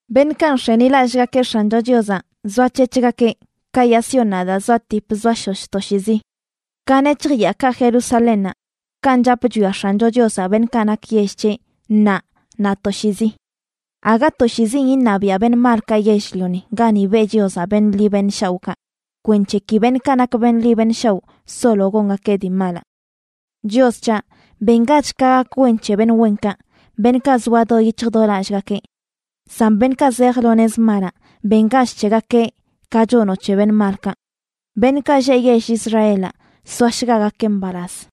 Beṉꞌkaꞌ nx̱enilallꞌgakeꞌ X̱ancho Chiozaꞌ zoac̱hec̱hgakeꞌ, ka yaa Siónnaꞌ daa zoatip zoashosh toshiizi. Ka nec̱hj yaakaꞌ Jerusalénnaꞌ kanꞌ chap chwiaꞌ X̱ancho Chiozaꞌ beṉꞌkaꞌ nak yell c̱heꞌ ṉaa naꞌ toshiizi. Aga toshiizin iṉabiaꞌ beṉꞌ malkaꞌ yell-lioni gani beꞌ Chiozaꞌ beṉꞌ ḻi beṉꞌ shaoꞌkaꞌ, kwenc̱he ki beṉꞌkaꞌ nak beṉꞌ ḻi beṉꞌ shaoꞌ solo gongakeꞌ dii malaꞌ. Chios c̱haꞌ, bengach ka gak wen c̱he beṉꞌ wenkaꞌ, beṉꞌkaꞌ zoa do yic̱hj do lallgakeꞌ; san beṉꞌkaꞌ zej lo nez malaꞌ, bengach c̱hegakeꞌ ka chonoꞌ c̱he beṉꞌ malkaꞌ. Beṉꞌkaꞌ lleꞌ yell Israelaꞌ soashgagakeꞌ mbalaz.